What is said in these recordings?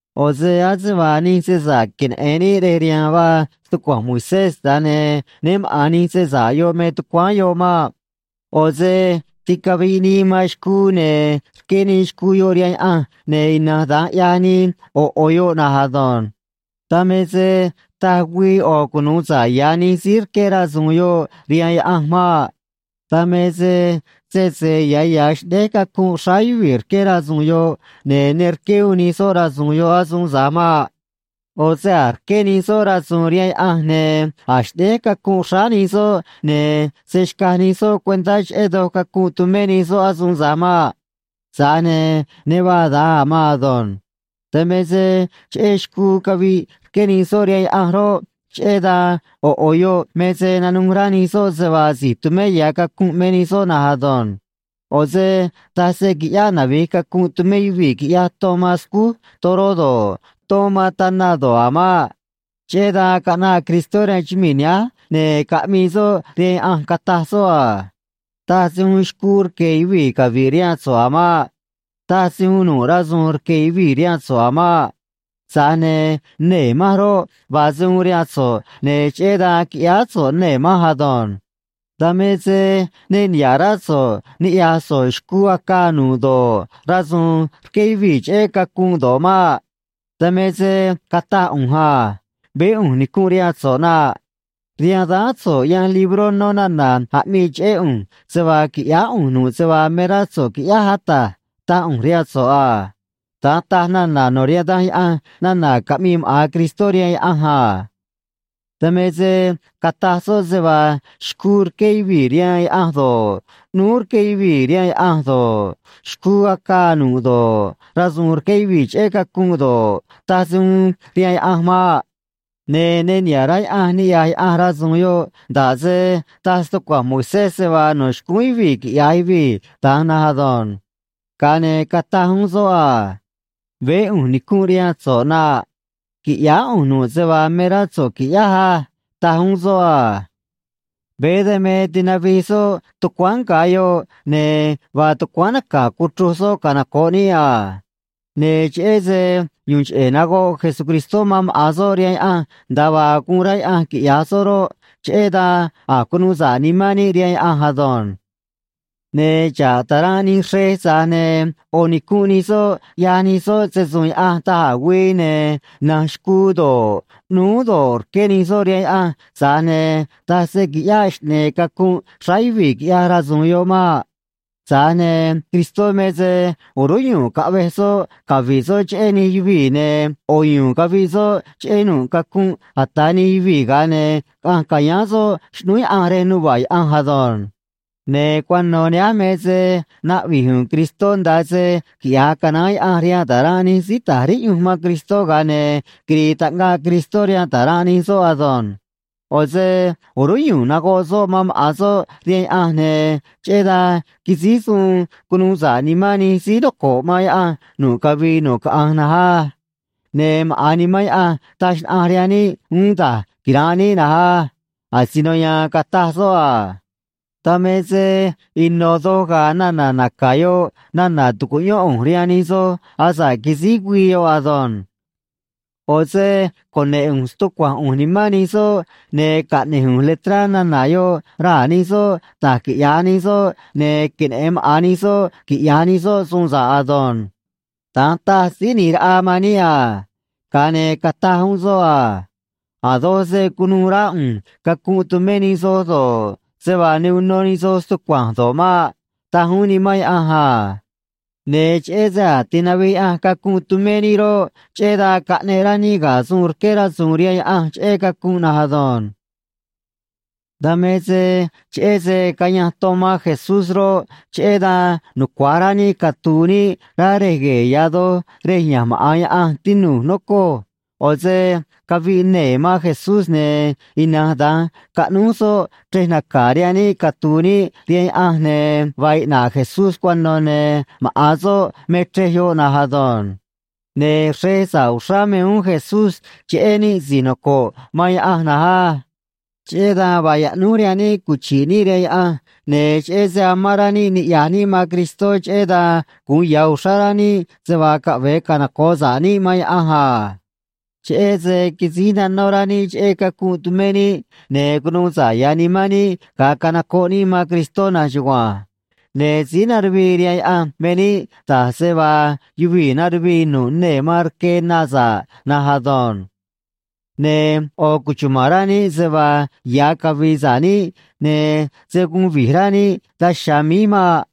ꞌO̱ se ase vaa nij se sa̱ꞌ queneꞌe̱n níꞌ rej riha̱a̱n vaa stucua̱nj Moisés, tza̱j ne̱ né maꞌa̱n nij se sa̱ꞌ yoꞌ me tucuáán yoꞌ maꞌ. ꞌO̱ se ticaviꞌ nii man xcuu, ne̱ rqué nii xcuu yoꞌ rihaan Yaꞌanj, ne̱ ina̱nj da̱nj ꞌyaj nii ꞌo̱ ꞌo̱ yoꞌ na̱nj ado̱nj. Dan me se taj güii ꞌo̱ cunu̱u sa̱ꞌ ya̱ nij síí rqué rasu̱u̱n yoꞌ rihaan Yaꞌanj maꞌ. Dan me se sese ya̱ ya̱ xꞌnéj cacunꞌ xráá yuvii̱ rqué rasu̱u̱n yoꞌ, ne̱ ne rqué uún nij soꞌ rasu̱u̱n yoꞌ asuun tza̱j maꞌ. ꞌO̱ se̱ a̱j rqué nij soꞌ rasu̱u̱n rihaan Yaꞌanj, ne̱ a̱j xꞌnéj cacunꞌ xráá nij soꞌ, ne̱ se̱ xcaj nij soꞌ cuentá cheꞌé doj cacunꞌ tumé nij soꞌ asuun tza̱j maꞌ. Tza̱j ne̱ ne vaa da̱nj a̱ maan ado̱nj. Dan me se cheꞌé xcuu caviꞌ rqué nij soꞌ rihaan Yaꞌanj roꞌ, cheꞌé dan ꞌo̱ ꞌo̱ yoꞌ me se nanuj rá nij soꞌ se vaa si̱j tumé ya̱ cacunꞌ me nij soꞌ na̱nj ado̱nj. ꞌO̱ se taj se qui̱ꞌyáꞌ navi̱j cacunꞌ tumé yuvii̱ quiꞌya̱j ton man scúj toró do̱ꞌ, ton man tana do̱ꞌ a̱ maꞌ. Cheꞌé dan caꞌnaꞌ Cristó rihaan chumii̱ nihánj, ne̱ caꞌmii soꞌ rihaan Yaꞌanj, cataj soꞌ a: Taj se uun xcuu rque̱ yuvii̱ cavi̱ꞌ rihaan so̱ꞌ a̱ maꞌ. Taj se uun nu̱ꞌ rasu̱u̱n rque̱ yuvii̱ rihaan so̱ꞌ a̱ maꞌ. Tza̱j ne̱ nee̱ manj roꞌ, vaa se uun rihaan so̱ꞌ, ne̱ cheꞌé dan quiꞌyáá so̱ꞌ nee̱ manj ado̱nj. Dan me se ne niha̱ꞌ rá so̱ꞌ niꞌya̱j so̱ꞌ xcuu acaa nu̱ꞌ do̱ꞌ, rasu̱u̱n rqué yuvii̱ cheꞌé cacunꞌ do̱ꞌ maꞌ. Dan me se cataj ꞌu̱nj a: “Veé ꞌu̱nj nicunꞌ rihaan so̱ꞌ na̱nꞌ. Rihaan dáán so̱ꞌ yanj libró nó nana̱ aꞌmii cheꞌé ꞌu̱nj, se vaa qui̱ꞌyáá ꞌu̱nj nu̱ꞌ se vaa me rá so̱ꞌ qui̱ꞌyáj, Ata̱j”, taj ꞌu̱nj rihaan so̱ꞌ a. Da̱nj taj nana̱ no̱ rihaan Danj Yaꞌanj, nana̱ caꞌmii maꞌa̱n Cristó rihaan Yaꞌanj a. Dan me se cataj soꞌ se vaa xcuu rqué yuvii̱ rihaan Yaꞌanj do̱ꞌ, ꞌnúú rqué yuvii̱ rihaan Yaꞌanj do̱ꞌ, xcuu acaa nu̱ꞌ do̱ꞌ, rasu̱u̱n rqué yuvii̱ cheꞌé cacunꞌ do̱ꞌ, taj se uun rihaan Yaꞌanj maꞌ. Ne̱ ne niha̱ꞌ rá Yaꞌanj ni̱ꞌyaj Yaꞌanj rasu̱u̱n yoꞌ nda̱ꞌ se taj stucua̱nj Moisés se vaa no̱ xcúún yuvii̱ quiꞌya̱j yuvii̱ da̱nj na̱nj ado̱nj. Ga̱a ne̱ cataj uún soꞌ a: “Veé ꞌu̱nj nicunꞌ rihaan so̱ꞌ, ꞌnaꞌ qui̱ꞌyáá ꞌu̱nj nu̱ꞌ se vaa me rá so̱ꞌ qui̱ꞌyáj á”, taj uún soꞌ a. Veé dan me tinavij soꞌ tucuáán nga̱ yoꞌ, ne̱ vaa tucuáán naca̱ cuchruj soꞌ canoco̱ꞌ níꞌ a. Ne̱ cheꞌé se yu̱u̱n cheꞌe̱ nagoꞌ Jesucristó man maꞌa̱n soꞌ rihaan Yaꞌanj nda̱a vaa guun rá Yaꞌanj quiꞌya̱j soꞌ roꞌ, cheꞌé dan a̱j cunuu sa̱ꞌ nimán níꞌ rihaan Yaꞌanj ado̱nj. Ne̱ xa̱ꞌ ta̱ranꞌ nij xrej, tza̱j ne̱ ꞌo̱ nicunꞌ nij soꞌ ꞌyaj nij soꞌ se‑su̱u̱n Yaꞌanj da̱j a̱ güii, ne̱ na̱nj xcuu do̱ꞌ, ꞌnúú do̱ꞌ, rqué nij soꞌ rihaan Yaꞌanj, tza̱j ne̱ taj se qui̱ꞌyáꞌ xꞌne̱e̱ cacunꞌ xráá yuvii̱ quiꞌya̱j rasu̱u̱n yoꞌ maꞌ. Tza̱j ne̱ Cristó me se o̱rúnꞌ yu̱u̱n caꞌvej soꞌ cavi̱ꞌ soꞌ cheꞌé nij yuvii̱, ne̱ ꞌo̱ yu̱u̱n caviꞌ soꞌ cheꞌé nu̱ꞌ cacunꞌ ata̱ nij yuvii̱, ga̱a ne̱ caꞌanj ca̱yáán soꞌ xꞌnúú Yaꞌanj rej nuva̱ꞌ Yaꞌanj ado̱nj. Ne̱ cuano̱ nihánj me se naꞌvi̱j u̱u̱n Cristó nda̱a se quiꞌya̱j canaán Yaꞌanj rihaan ta̱ranꞌ nij síí ta̱j riꞌyunj man Cristó, ga̱a ne̱ quiri̱i̱ taꞌngaꞌ Cristó rihaan ta̱ranꞌ nij soꞌ ado̱nj. ꞌO̱ se o̱rúnꞌ yu̱u̱n nagoꞌ soꞌ man maꞌa̱n soꞌ rihaan Yaꞌanj, ne̱ cheꞌé dan quisíj suun cunu̱u sa̱ꞌ nimán nij síí noco̱ꞌ man Yaꞌanj nu̱ꞌ cavii nu̱ꞌ caꞌanj na̱nj á. Ne̱ maꞌa̱n Nimán Yaꞌanj taj xnaꞌanj rihaan níꞌ uún da̱j quira̱nꞌ níꞌ na̱nj á. Asino ya̱a̱n cataj soꞌ a: Dan me se ino̱ doj ga̱a̱ nana̱ naca̱ yoꞌ nana̱ tu̱cuꞌyón ꞌu̱nj rihaan nij soꞌ asa̱ꞌ quisíj güii yoꞌ ado̱nj. ꞌO̱ se cune̱ꞌ ꞌu̱nj stucua̱nj ꞌu̱nj nimán nij soꞌ, ne̱ caꞌne̱j ꞌu̱nj letrá nana̱ yoꞌ raa̱ nij soꞌ da̱j quiꞌya̱j nij soꞌ, ne̱ queneꞌe̱n maꞌa̱n nij soꞌ quiꞌya̱j nij soꞌ suun sa̱ꞌ ado̱nj. Da̱nj taj Síí ꞌNi̱j Raꞌa man níꞌ a. Ga̱a ne̱ cataj uún soꞌ a: A̱ doj se̱ cunuû rá ꞌu̱nj cacunꞌ tumé nij soꞌ do̱ꞌ, se vaa ne uno nij soꞌ stucua̱nj do̱ꞌ maꞌ, taj uún Nimán Yaꞌanj a. Ne̱ cheꞌé se a̱j tinavij Yaꞌanj cacunꞌ tumé níꞌ roꞌ, cheꞌé dan caꞌneꞌ rá níꞌ ga̱ suun rqué rasu̱u̱n rihaan Yaꞌanj cheꞌé cacunꞌ na̱nj ado̱nj. Dan me se cheꞌé se cayanj ton man Jesús roꞌ, cheꞌé dan nucua̱j rá níꞌ catu̱u̱ níꞌ rá Rej Gue̱e̱ Ya̱ Doj rej ya̱nj maꞌa̱n Yaꞌanj, tinu̱j, nocoj. ꞌO̱ se caviꞌ nee̱ man Jesús, ne̱ ina̱nj da̱nj caꞌnúj soꞌ chrej naca̱ rihaan níꞌ catu̱u̱ níꞌ rihaan Yaꞌanj, ne̱ vaa iꞌna̱ꞌ Jesús cuano̱ ne̱ maꞌa̱n soꞌ me chrej yoꞌ na̱nj ado̱nj. Ne̱ xrej sa̱ꞌ uxrá me uún Jesús cheꞌé níꞌ si̱j noco̱ꞌ man Yaꞌanj na̱nj á. Cheꞌé dan vaa yaꞌnúj rihaan níꞌ cuchi̱ꞌ níꞌ rihaan Yaꞌanj, ne̱ cheꞌé se amán rá níꞌ niꞌya̱j níꞌ man Cristó, cheꞌé dan gu̱un ya̱ uxrá rá níꞌ se vaa caꞌve̱e canoco̱ꞌ sa̱ꞌ níꞌ man Yaꞌanj a. Cheꞌé se quisíj nanó rá níꞌ cheꞌé cacunꞌ tumé níꞌ, ne̱ cunuu sa̱ꞌ ya̱ nimán níꞌ, ga̱a canocoꞌ níꞌ man Cristó na̱nj chugua̱nj. Ne̱ síí naruvii rihaan Yaꞌanj me níꞌ, da̱j se vaa yuvii̱ naruvii nu̱ꞌ nee̱ man rque na sa̱ꞌ na̱nj ado̱nj. Ne̱ ꞌo̱ cuchuma̱n rá níꞌ se vaa ya̱ cavi̱i̱ sa̱ꞌ níꞌ, ne̱ se̱ guun vi̱j rá níꞌ daj chiha̱a̱ míj maꞌ.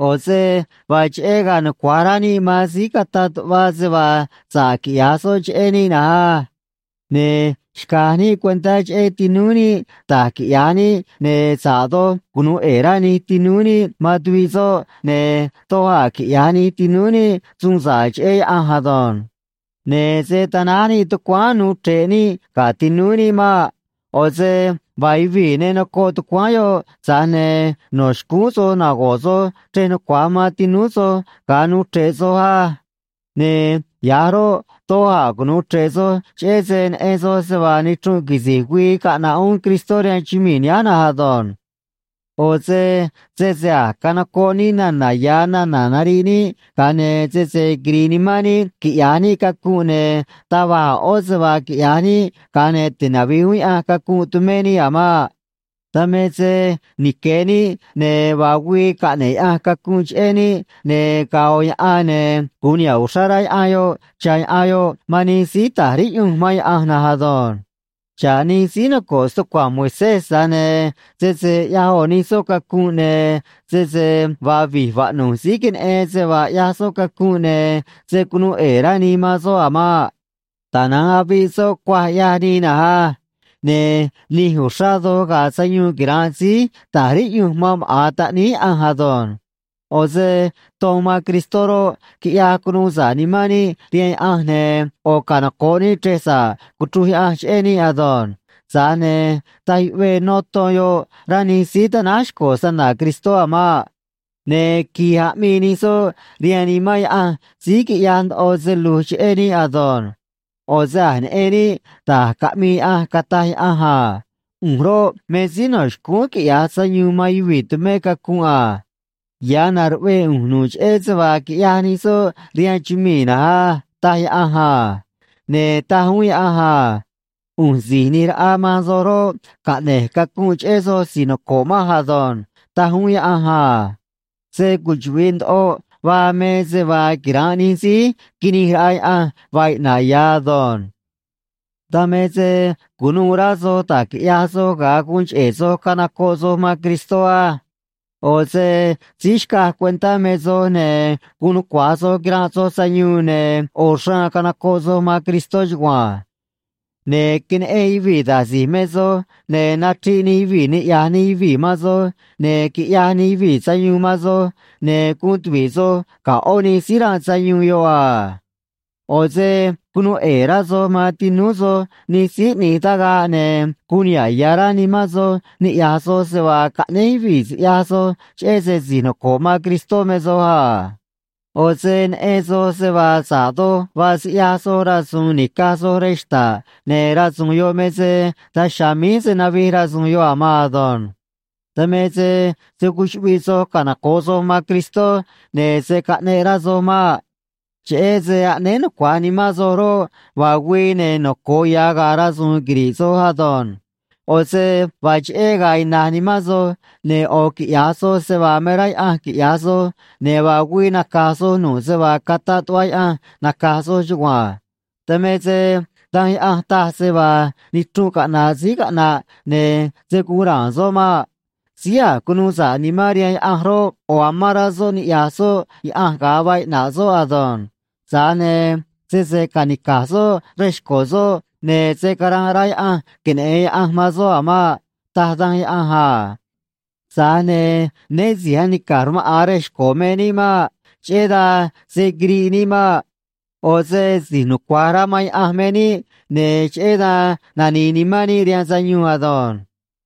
ꞌO̱ se vaa cheꞌé ga̱a̱ nucua̱j rá níꞌ man síí cataꞌ tuꞌva se vaa sa̱ꞌ quiꞌya̱j soꞌ cheꞌé níꞌ na̱nj á. Ne̱ xca̱j níꞌ cuentá cheꞌé tinúú níꞌ da̱j quiꞌya̱j níꞌ ne̱ sa̱ꞌ doj cunu̱u ꞌe̱e̱ rá nij tinúú níꞌ man tuviꞌ soꞌ, ne̱ doj a̱ quiꞌya̱j nij tinúú níꞌ suun sa̱ꞌ cheꞌé Yaꞌanj ado̱nj. Ne̱ se̱ tanáj níꞌ tucuáán nuu chre̱ꞌ níꞌ ga̱ tinúú níꞌ maꞌ. ꞌO̱ se vaa yuvii̱ ne nocoꞌ tucuáán yoꞌ, tza̱j ne̱ no̱ xcúún soj nago̱ꞌ soj chrej nucua̱j man tinúú soj ga̱a nuu chre̱ꞌ soj á. Ne̱ ya̱j roꞌ, doj a̱ cunu̱u chre̱ꞌ soj, cheꞌé se neꞌen soj se vaa nichrunꞌ quisi̱j güii caꞌna̱ꞌ uún Cristó rihaan chumii̱ nihánj na̱nj ado̱nj. ꞌO̱ se sese a̱j canocoꞌ níꞌ nana̱ ya̱ nana̱ nariꞌ níꞌ, ga̱a ne̱ sese quiri̱i̱ nimán níꞌ quiꞌya̱j níꞌ cacunꞌ, ne̱ taj va̱j ꞌó se vaa quiꞌya̱j níꞌ ga̱a ne̱ tinavi̱j uún Yaꞌanj cacunꞌ tumé níꞌ a̱ maꞌ. Dan me se nique̱ níꞌ, ne̱ vaa güii caꞌne̱ꞌ Yaꞌanj cacunꞌ cheꞌé níꞌ, ne̱ ga̱a̱ ꞌo̱ yaꞌan, ne̱ gu̱un niha̱ꞌ uxrá rá yaꞌan yoꞌ cha̱ yaꞌan yoꞌ man nij síí ta̱j riꞌyunj man Yaꞌanj na̱nj ado̱nj. Xa̱ꞌ nij síí noco̱ꞌ stucua̱nj Moisés, tza̱j ne̱ sese ꞌyaj ꞌo̱ nij soꞌ cacunꞌ, ne̱ sese vaa vi̱j vaꞌnu̱j síí queneꞌen se vaa ꞌyaj soꞌ cacunꞌ, ne̱ se̱ cunuu ꞌe̱e̱ rá nii man soꞌ a̱ maꞌ. Tana̱nj aviꞌ soꞌ cuaj, ꞌyaj nii na̱nj á. Ne̱ nij uxrá doj ga̱a̱ sayuun quira̱nꞌ síí ta̱j riꞌyunj man maꞌa̱n Taꞌníí Yaꞌanj ado̱nj. ꞌO̱ se ton man Cristó roꞌ, quiꞌyaj cunuu sa̱ꞌ nimán níꞌ rihaan Yaꞌanj ne̱ ꞌo̱ canocoꞌ níꞌ chrej sa̱ꞌ cuchruj Yaꞌanj cheꞌé níꞌ ado̱nj. Tza̱j ne̱ taj yuꞌvee nó ton yoꞌ, rá nij síí tanáj xco̱ snana̱ Cristó a̱ maꞌ. Ne̱ qui̱j aꞌmii nij soꞌ rihaan Nimán Yaꞌanj síí quiꞌyaj ndoꞌo se lu̱j cheꞌé níꞌ ado̱nj. ꞌO̱ se a̱j neꞌen níꞌ da̱j caꞌmii Yaꞌanj, cataj Yaꞌanj a: “ꞌU̱nj roꞌ, me síí no̱ xcúún quiꞌya̱j sayuun man yuvii̱ tumé cacunꞌ a. Ya̱ na̱ruꞌvee ꞌu̱nj nu̱ꞌ cheꞌé se vaa quiꞌyaj nij soꞌ rihaan chumii̱ na̱nj á”, taj Yaꞌanj a. Ne̱ taj uún Yaꞌanj a: “ꞌU̱nj Si̱j ꞌNi̱j Raꞌa man soj roꞌ, caꞌne̱j cacunꞌ cheꞌé soj si̱j noco̱ꞌ manj ado̱nj”, taj uún Yaꞌanj a. Se cuchuꞌvi̱ꞌ ndoꞌo vaa me se vaa quira̱nꞌ nij síí quinij raꞌa Yaꞌanj vaa iꞌna̱ꞌ ya̱ ado̱nj. Dan me se cu̱nuû rá soj da̱j quiꞌyaj soj ga̱a guun cheꞌe̱ soj canocoꞌ soj man Cristó á. ꞌO̱ se síí xcaj cuentá me soj, ne̱ guun nucua̱j soj quiranꞌ soj sayuun, ne̱ ꞌo̱ xraan canocoꞌ soj man Cristó chugua̱nj. Ne̱ queneꞌen yuvii̱ da̱j si̱j me soj, ne̱ nachriꞌ nij yuvii̱ niꞌya̱j nij yuvii̱ man soj, ne̱ quiꞌyaj nij yuvii̱ sayuun man soj, ne̱ guun tuvi̱ꞌ soj ga̱ ꞌó nij síí ranꞌ sayuun yoꞌ a. ꞌO̱ se cunuu ꞌe̱e̱ rá soj man tinúú soj nij síí ꞌni̱j tagaꞌ, ne̱ guun niha̱ꞌ ya̱ rá nimán soj niꞌya̱j soj se vaa caꞌnéj yuvii̱ siꞌyaj soj cheꞌé se si̱j noco̱ꞌ man Cristó me soj a. ꞌO̱ se neꞌen soj se vaa sa̱ꞌ doj vaa siꞌyaj soj rasu̱u̱n nica̱j soj rej xta̱ꞌ, ne̱ rasu̱u̱n yoꞌ me se daj chiha̱a̱ míj se̱ navij rasu̱u̱n yoꞌ a̱ maan ado̱nj. Dan me se se̱ cuchuꞌviꞌ soj canoco̱ꞌ soj man Cristó, ne̱ se̱ caꞌneꞌ rá soj maꞌ. Cheꞌé se aꞌnéé nucua̱j nimán soj roꞌ, vaa güii, ne̱ noco̱o ya̱ ga̱a̱ rasu̱u̱n quiri̱ꞌ soj ado̱nj. ꞌO̱ se vaa cheꞌé ga̱a̱ ina̱j nimán soj, ne̱ ꞌo̱ quiꞌya̱j soj se vaa me rá Yaꞌanj quiꞌya̱j soj, ne̱ vaa güii naca̱j soj nu̱ꞌ se vaa cataꞌ tuꞌva Yaꞌanj naca̱j soj chugua̱nj. Dan me se Danj Yaꞌanj taj se vaa nichrunꞌ caꞌna̱ꞌ síí caꞌna̱ꞌ, ne̱ se̱ guun ra̱a̱n soꞌ maꞌ. Síí a̱j cunuu sa̱ꞌ nimán rihaan Yaꞌanj roꞌ, ꞌo̱ amán rá soꞌ niꞌya̱j soꞌ Yaꞌanj ga̱a vaa iꞌna̱ꞌ soꞌ ado̱nj. Tza̱j ne̱ sese ca̱nica̱j soꞌ rej xco̱ soꞌ, ne̱ se̱ caranꞌ rá Yaꞌanj queneꞌe̱n Yaꞌanj man soꞌ a̱ maꞌ, taj Danj Yaꞌanj a. Tza̱j ne̱ né si̱j anica̱j rmaꞌa̱n rej xco̱ me níꞌ maꞌ. Cheꞌé dan se̱ quiriꞌ níꞌ maꞌ. ꞌO̱ se si̱j nucua̱j rá man Yaꞌanj me níꞌ, ne̱ cheꞌé dan nani̱i̱ nimán níꞌ rihaan sayuun ado̱nj.